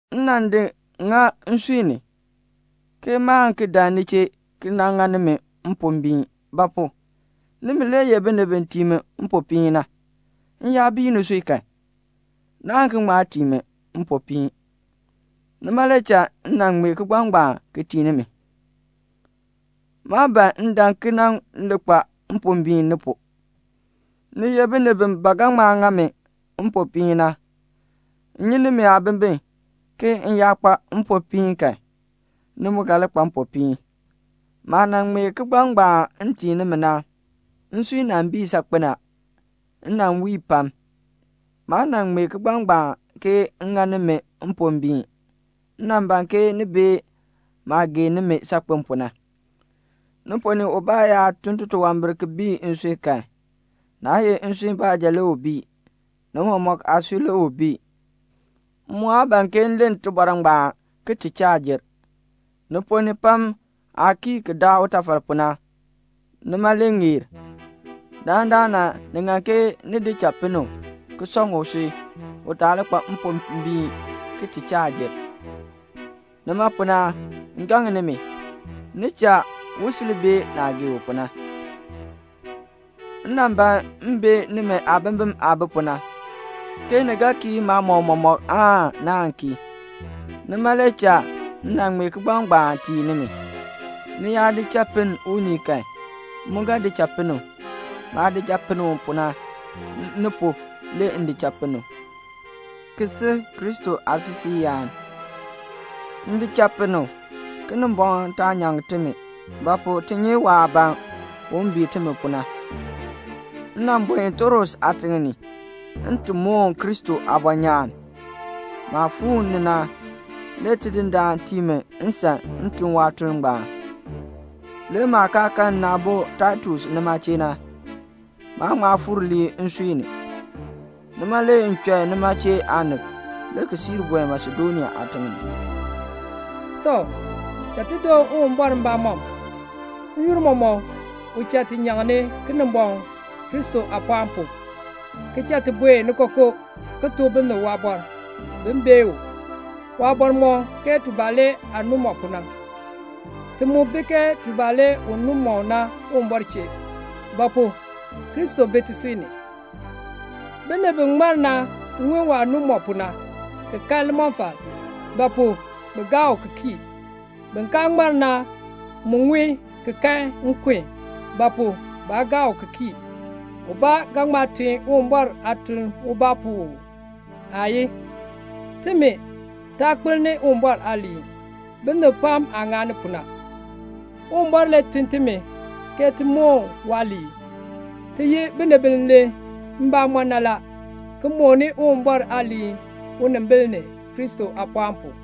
M nan di ŋa nsui ni, ke maan ki dan ni chee ki ŋa nimi mpombiin. Ba pu? nimi le ye binib bi tii mi mpopiin na. M yaa bii nisui kan, naan ki ŋma tii mi mpopiin. Nima le cha m nan ŋmee kigbaŋ ngbaan ki tii nimi. Maa ban m dan ki nan li kpa mpombiin ni pu. Ni ye binib bi ba ga ŋma ŋa mi mpopiin na. M nyi nimi aabimbin, ke m yaa kpa mpopiin kan, ni mu ga li kpa mpopiin. Maah nan ŋmee kigbaŋ ngbaan m tii nimi na, nsui nan bii saakpen a. M nan wii pam. Maa nan ŋmee kigbaŋ ngbaan ke m ŋa nimi mpombiin, m nan ban ke ni bee maah gee nimi saakpen pu na. Ni ponn ni ubaa yaa tun titunwambir ki bii nsui kan, naa ye nsui baanja le u bii, ni mɔmɔk aasui le u bii. M mu aa ban ke m len tibɔr ngbaan ki ti chaa jer. Ni ponn ni pam aah kii ki daa utafal pu na, nima le ŋeer. Dandana ni ŋan ke ni di cha pinn u, ki sɔŋ usui, u taa li kpa mpombiin ki ti chaa jer. Nima pu na, m gaŋ nimi, ni cha u sil bee naah gee u pu na. M nan ban m bee nimi aabimbin aah bi pu na, ke ni ga kii maamɔb mɔmɔk aan naan kii. Nima le cha m nan ŋmee kigbaŋ ngbaan tii nimi. Ni yaa di cha pinn unii kan, m mu ga di cha pinn u. Maah di cha pinn u pu na, ni pu, le m di cha pinn u, ki si Kristo aasisiiyaan. M di cha pinn u, Kinimbɔŋ taa nyaŋ timi; ba pu? ti nyi waah ban un bii timi pu na. M nan buen Troas aatiŋ ni, m ti moon Kristo aabɔnyaan. Maah fuu ni na, le Tidindaan tii mi nsan m tun waatuln ngbaan. Le maah kaa kan nna aabo Taitus nima chee na, maa ŋma fuur lii nsui ni. Nima le m chɔi nima chee aanib, le ki siir buen Masedonia aatiŋ ni. Tɔ, cha ti doon Uwumbɔr mbamɔm. N-yoonn mɔmɔk u cha ti nyaŋni Kinimbɔŋ, Kristo aapɔɔn pu, ki cha ti buen ni kookoo, ki tuk binib waabɔr, bin bee u. Waabɔr mɔ ke tubalee aah nu mɔ pu na. Ti mu bi ke tubalee u nu mɔ na Uwumbɔr chee; ba pu? Kristo bi tisui ni. Binib bi ŋmar na ŋun waah nu mɔ pu na, ki kan limɔfal; ba pu? bi gaa u ki kii. Bin kaa ŋmar na mu ŋun ki kan nkun; ba pu? baa gaa u ki kii. Ubaa ga ŋma tun Uwumbɔr aatuln ubaa pu uu? Aayii. Timi, taa kpelni Uwumbɔr aaliin, binib pam aah ŋani pu na. Uwumbɔr le tun timi ke ti moon waaliin. Ti ye binib bi len mbamɔn na la, ki mooni Uwumbɔr aaliin unimbil ni, Kristo aapɔɔn pu.